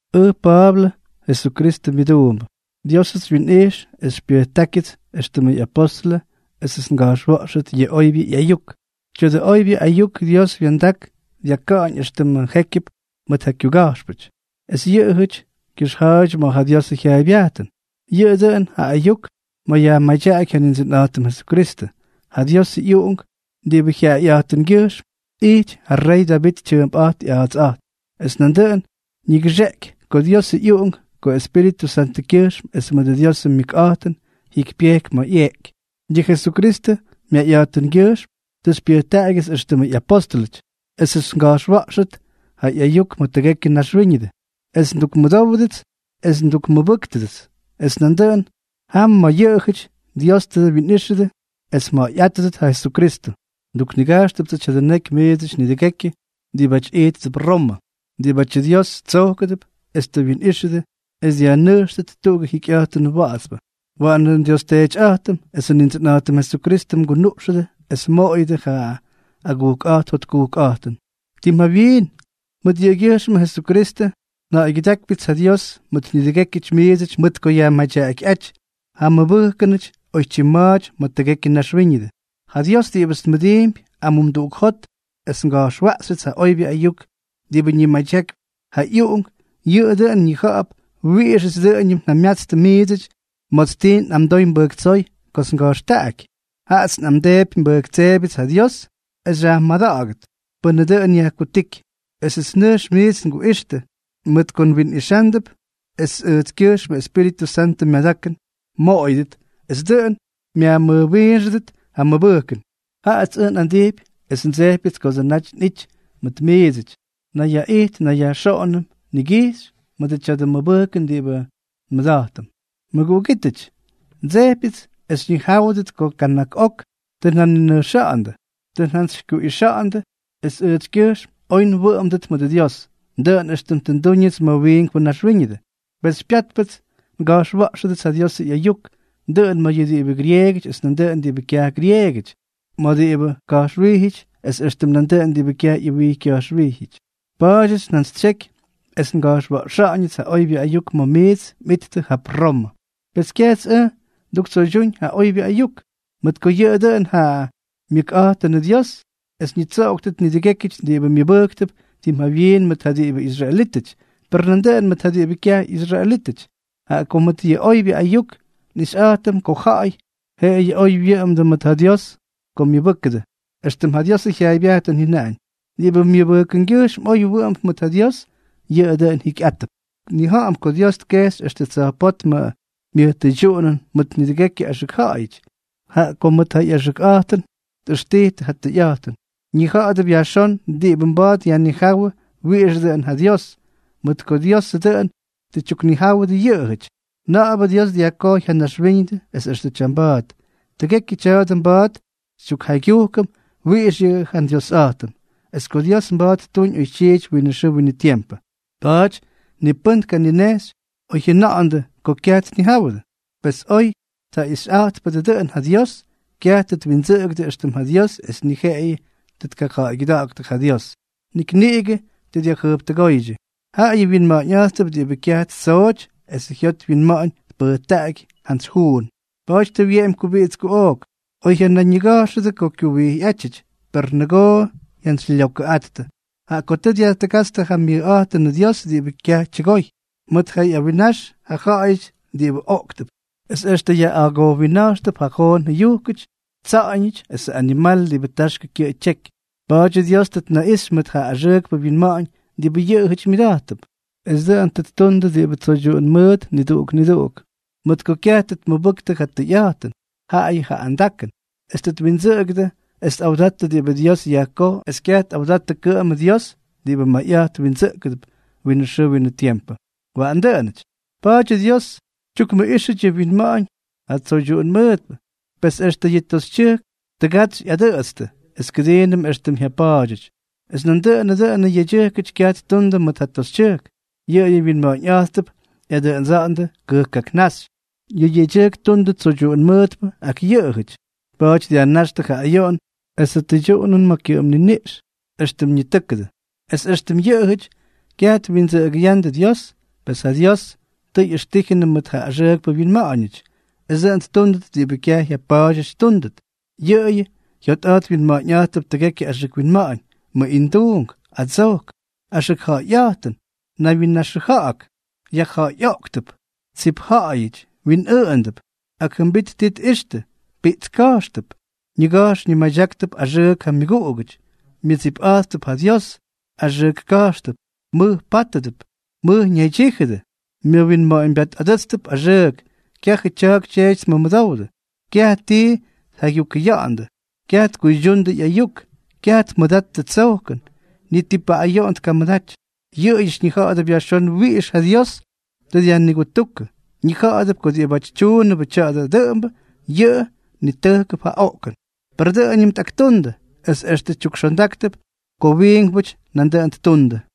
Ʉj Pa̱a̱blʉ, Jesukristʉ myʉduumbʉ. Diósʉts xywyinꞌijx es xypyʉjtákyʉts éxtʉmʉ ꞌyapóstʉlʉ esʉts nga̱jxwa̱ꞌxʉt yʉ oybyʉ ꞌyayuk. Tya̱dʉ oybyʉ ayuk Dios wya̱ndak dyakáñ extʉ jékyʉp mʉt ja kyuga̱jxpʉty, es yʉꞌʉjʉty kyʉxja̱a̱ydyʉ ma̱ ja Diosʉ jyaaybyajtʉn. Yʉꞌʉ dʉꞌʉn ja ayuk ma̱ yajmadyaꞌaky ja Nindsʉnꞌa̱jtʉm Jesukristʉ, ja Diosʉ ꞌyUꞌunk diꞌibʉ jyaꞌayꞌa̱jtʉngyʉjxm ijty ja rey Davit tyʉʉmp ꞌya̱a̱ts, es nandʉꞌʉn ñigʉxeꞌeky ko Diosʉ ꞌyUꞌunk ko Espíritʉ Santʉkyʉjxm es mʉdʉ Diosʉ myʉkꞌa̱jtʉn jyikypyejky ma̱ ꞌyeꞌky. Yʉ Jesukristʉ myayꞌa̱jtʉngyʉjxm tʉ xypyʉjtaꞌagyʉts éxtʉmʉ ꞌyapóstʉlʉty, esʉts nga̱jxwa̱ꞌxʉt ja ꞌyayuk ma̱ tʉgekyʉ naxwíñʉdʉ, es ndukmʉmʉdówʉdʉts es ndukmʉbʉ́ktʉdʉts. Es nandʉꞌʉn jam ma̱ yʉꞌʉjʉty Dios tʉ mwinꞌíxʉdʉ es mja̱ꞌa̱yꞌátʉdʉt ja Jesukristʉ. Nduknigajxtʉptsʉ tya̱dʉ neky miidsʉty nidʉgekyʉ diꞌibáty ijttʉp Romʉ, diꞌibátyʉ Dios tsojkʉdʉp es tʉ wyinꞌíxʉdʉ es dyajnʉjxtʉt tuꞌugʉ jikyꞌa̱jtʉn wa̱ꞌa̱tspʉ. Waꞌanʉ nDios Teetyꞌa̱jtʉm esʉ Nindsʉnꞌa̱jtʉm Jesukristʉ mgunuꞌxʉdʉ es mmoꞌoyʉdʉ ja agujkꞌa̱jt jotkujkꞌa̱jtʉn. Tim jawyiin, mʉt yʉꞌʉgyʉjxmʉ Jesukristʉ, nja̱ꞌa̱ygyʉdákypyʉts ja Dios mʉt nidʉgékyʉty miidsʉty mʉt ko yajmadyaꞌakyꞌáty ja mmʉbʉjkʉnʉty oytyim ma̱a̱ty ma̱ tʉgekyʉ naxwíñʉdʉ. Ja Dios diꞌibʉts nmʉdiimpy amumduꞌuk jot es nga̱jxwaꞌxyʉts ja oybyʉ ayuk diꞌibʉ ñimadyakypy ja ꞌyUꞌunk, yʉꞌʉ dʉꞌʉn ñija̱ꞌa̱p wiꞌixʉts dʉꞌʉñʉm njamyatstʉ miidsʉty ma̱ts ti nꞌamdoy nbʉjktsóy kots nga̱jxtaꞌaky. Jaꞌats nꞌamdeepy nbʉjktseebyʉts ja Dios es xyajmada̱ꞌa̱gʉt, pʉnʉ dʉꞌʉn yajkutíky, esʉts nʉjx miits nguꞌixtʉ, mʉt ko nwinꞌixándʉp es ʉjtskyʉjxmʉ Espíritʉ Santʉ myadakʉn mmoꞌoyʉdʉt, es dʉꞌʉn myajmʉjwiinxʉdʉ ja mmʉbʉjkʉn. Jaꞌats ʉj nꞌandijpy es ndsejpyʉts kodsʉ naty nꞌity mʉt miidsʉty, nnayyaꞌijt nnayyajxoꞌonʉm nigijxy mʉdʉ tya̱dʉ mʉbʉjkʉn diꞌibʉ nmʉda̱jtʉm. Mʉguꞌugítʉty, ndsejpyʉts es xyñijáwʉdʉt ko kana̱k ok tʉ njaninʉjxa̱ꞌa̱ndʉ. Tʉ njantsyjyakuꞌixa̱ꞌa̱ndʉ es ʉjtskyʉjxm oy mwʉꞌʉmdʉt mʉdʉ Dios, dʉꞌʉn éxtʉm tʉ ndúñʉts ma̱ yʉ wiinkpʉ naxwíñʉdʉ. Pes xypyátpʉts nga̱jxwa̱ꞌxʉdʉts ja Diosʉ ꞌyayuk, dʉꞌʉn ma̱ yʉ diꞌibʉ grieegʉty es nandʉꞌʉn diꞌibʉ kyaj gyrieegʉty, ma̱ diꞌibʉ ʉwijy ka̱jxwijyʉty es éxtʉm nandʉꞌʉn diꞌibʉ kyaj ꞌyʉwijy kya̱jxwijyʉty. Pa̱a̱dyʉts njantsytsyeky es nga̱jxwa̱ꞌxa̱ꞌa̱ñʉts ja oybyʉ ayuk ma̱ miits mꞌittʉ jap Romʉ. Pes kyajts ʉj nduktsoydyúñ ja oybyʉ ayuk, mʉt ko yʉꞌʉ dʉꞌʉn ja myʉkꞌa̱jtʉnʉ Dios es ñitsoꞌoktʉt nidʉgékyʉty diꞌibʉ myʉbʉjktʉp, tim jawyiin mʉt ja diꞌibʉ israelítʉty, per nandʉꞌʉn mʉt ja diꞌibʉ kyaj ꞌyisraelítʉty. Jaꞌa ko mʉt yʉ oybyʉ ayuk nꞌixyꞌa̱jtʉm ko ja̱ꞌa̱y jeꞌeyʉ oy wyʉꞌʉmdʉ mʉt ja Dios ko myʉbʉ́kʉdʉ, éxtʉm ja Diosʉ jyaaybyajtʉn jyʉnaꞌañ: “Diꞌibʉ myʉbʉjkʉngyʉjxm oy wʉꞌʉmp mʉt ja Dios, yʉꞌʉ dʉꞌʉn jikyꞌátʉp.” Nnija̱ꞌa̱m ko Dios tkexy extʉ tsa̱jpótmʉ myʉj tʉydyuꞌunʉn mʉt nidʉgekyʉ axʉk ja̱ꞌa̱yʉty, jaꞌa ko mʉt ja ꞌyaxʉkꞌa̱jtʉn tꞌʉxtijtʉ ja tʉyꞌa̱jtʉn. Ñija̱ꞌa̱dʉp yajxón diꞌibʉ mba̱a̱t yajnijáwʉ wiꞌixʉ dʉꞌʉn ja Dios, mʉt ko Diosʉ dʉꞌʉn tʉ tyuknijáwʉdʉ yʉꞌʉjʉty. Na̱ꞌa̱bʉ Dios dyajkojy ja naxwíñʉdʉ es extʉ tyamba̱a̱t, tʉgekyʉ tya̱a̱dʉ mba̱a̱t xytyukjaygyujkʉm wiꞌix yʉꞌʉ ja Dyiosꞌa̱jtʉn, es ko Dios mba̱a̱t ttuñ oytyiity winʉ xʉʉ winʉ tiempʉ. Pa̱a̱ty ni pʉ́n tkanimeꞌxy oy jyajʉna̱ꞌa̱ndʉ ko kyaj tnijáwʉdʉ. Pes oy tjaꞌixyꞌa̱jtpʉdʉ dʉꞌʉn ja Dios, kyaj tʉ twindsʉꞌʉgʉdʉ éxtʉm ja Dios es ni jeꞌeyʉ tʉ tkaja̱ꞌa̱ygyʉda̱ꞌa̱ktʉ ja Dios, nik niꞌigʉ tʉ dyajjʉjptʉgóydyʉ. Jaꞌayʉ wyinma̱ꞌa̱ñꞌa̱jttʉp diꞌibʉ kyaj ti ttsooty esʉ jyot wyinma̱ꞌa̱ñ tpʉjtaꞌaky jantsy juun. Pa̱a̱ty tʉ wyeꞌemy kubiꞌits kuꞌook. Oy jyanayñiga̱jxʉdʉ ko kyuwijyꞌátyʉty, per nʉgoo jyantsylyokʉꞌattʉ. Jaꞌa ko tʉ dyajtʉgátstʉ ja myʉjꞌa̱jtʉnʉ Dios diꞌibʉ kyaj tyʉgoy, mʉt ja ꞌyawinnax ja ja̱ꞌa̱yʉty diꞌibʉ oꞌktʉp, es extʉ yaꞌꞌagojwinna̱jxtʉp ja joon jʉyujkʉty, tsa̱ꞌa̱ñʉty esʉ añimal diꞌibʉ taxkʉ kyʉꞌʉ tyeky. Pa̱a̱dyʉ Dios tʉ tnaꞌixy mʉt ja axʉʉkpʉ winma̱ꞌa̱ñ diꞌibʉ yʉꞌʉjʉty myʉda̱jttʉp, es dʉꞌʉn tʉ ttundʉ diꞌibʉ tsoydyuꞌun mʉʉt niduꞌuk niduꞌuk. Mʉt ko kyaj tʉ tmʉbʉktʉ ja tʉyꞌa̱jtʉn, jaꞌayʉ ja andakʉn, es tʉ twindsʉꞌʉgʉdʉ es tꞌawdattʉ diꞌibʉ Dios yajkoj es kyaj tꞌawdattʉ kʉꞌʉmʉ Dios diꞌibʉ mayꞌa̱jt windsʉꞌkʉp winʉ xʉʉ winʉ tiempʉ. Waꞌan dʉꞌʉnʉty. Pa̱a̱dyʉ Dios tyukmʉꞌíxʉty yʉ wyinma̱ꞌa̱ñ ja tsoydyuꞌun mʉʉtpʉ. Pes extʉ yʉ toxytyʉjkʉty tʉgatsy ꞌyadʉꞌʉtstʉ es kʉdiinʉm éxtʉm jyapa̱a̱dyʉty. Es nandʉꞌʉnʉ dʉꞌʉnʉ yedyʉjkʉty kyaj ttundʉ mʉt ja toxytyʉjk, yʉꞌʉyʉ wyinma̱ꞌa̱ñꞌa̱jttʉp ꞌyadʉꞌʉdsa̱ꞌa̱ndʉ kʉjkkaknáxy. Yʉ yedyʉjkʉty ttundʉ tsoydyuꞌun mʉʉtpʉ ak yʉꞌʉjʉty, pa̱a̱ty dyajnáxtʉ ja ayoꞌon esʉ tʉydyuꞌunʉn ma̱ ja kyʉꞌʉm niniꞌx, éxtʉm ñitʉ́kʉdʉ. Es éxtʉm yʉꞌʉjʉty kyaj twindsʉꞌʉgʉya̱ꞌa̱ndʉ Dios, pes ja Dios tʉ ꞌyʉxtíjʉnʉ mʉt ja axʉʉkpʉ winma̱ꞌa̱ñʉty, es dʉꞌʉn ttúndʉt diꞌibʉ kyaj jyapa̱a̱dyʉty ttúndʉt. Yʉꞌʉyʉ jyotꞌa̱jt wyinma̱ꞌa̱ñꞌa̱jttʉp tʉgekyʉ axʉk winma̱ꞌa̱ñ, mʉꞌinduunk, adsojk, axʉkja̱ꞌa̱yꞌa̱jtʉn, naywyinnaxʉja̱ꞌa̱k, yajja̱ꞌa̱yꞌoꞌktʉp, tsip ja̱ꞌa̱yʉty, winꞌʉꞌʉndʉp, ak jʉmbit ti tꞌixtʉ, piꞌtska̱jxtʉp, ñiga̱jx ñimadyáktʉp axʉʉk ja myʉguꞌugʉty, myʉdsipꞌa̱jttʉp ja Dios, axʉk ka̱jxtʉp, mʉj pátʉdʉp, mʉj ñaydyíjʉdʉ, myʉwinma̱ꞌa̱ñbyatꞌadʉ́tstʉp axʉʉk, kyajʉ tya̱a̱k tyeety tmʉmʉdowdʉ, kyaj ti tjaygyukʉya̱ꞌa̱ndʉ, kyaj tkuydyundʉ ꞌyayuk, kyaj tmʉdattʉ tsojkʉn, ni ti paꞌꞌayoꞌon tkamʉdaty. Yʉꞌʉjʉty ñija̱ꞌa̱dʉp yajxón wiꞌix ja Dios tʉ dyajnigutúkʉ. Ñija̱ꞌa̱dʉp ko diꞌibáty tyuundʉbʉ tya̱a̱dʉ dʉꞌʉmbʉ, yʉꞌʉ nitʉjkʉp ja oꞌkʉn; per dʉꞌʉñʉm tꞌaktundʉ, es extʉ tyukxondáktʉp ko wiinkpʉty nandʉꞌʉn ttundʉ.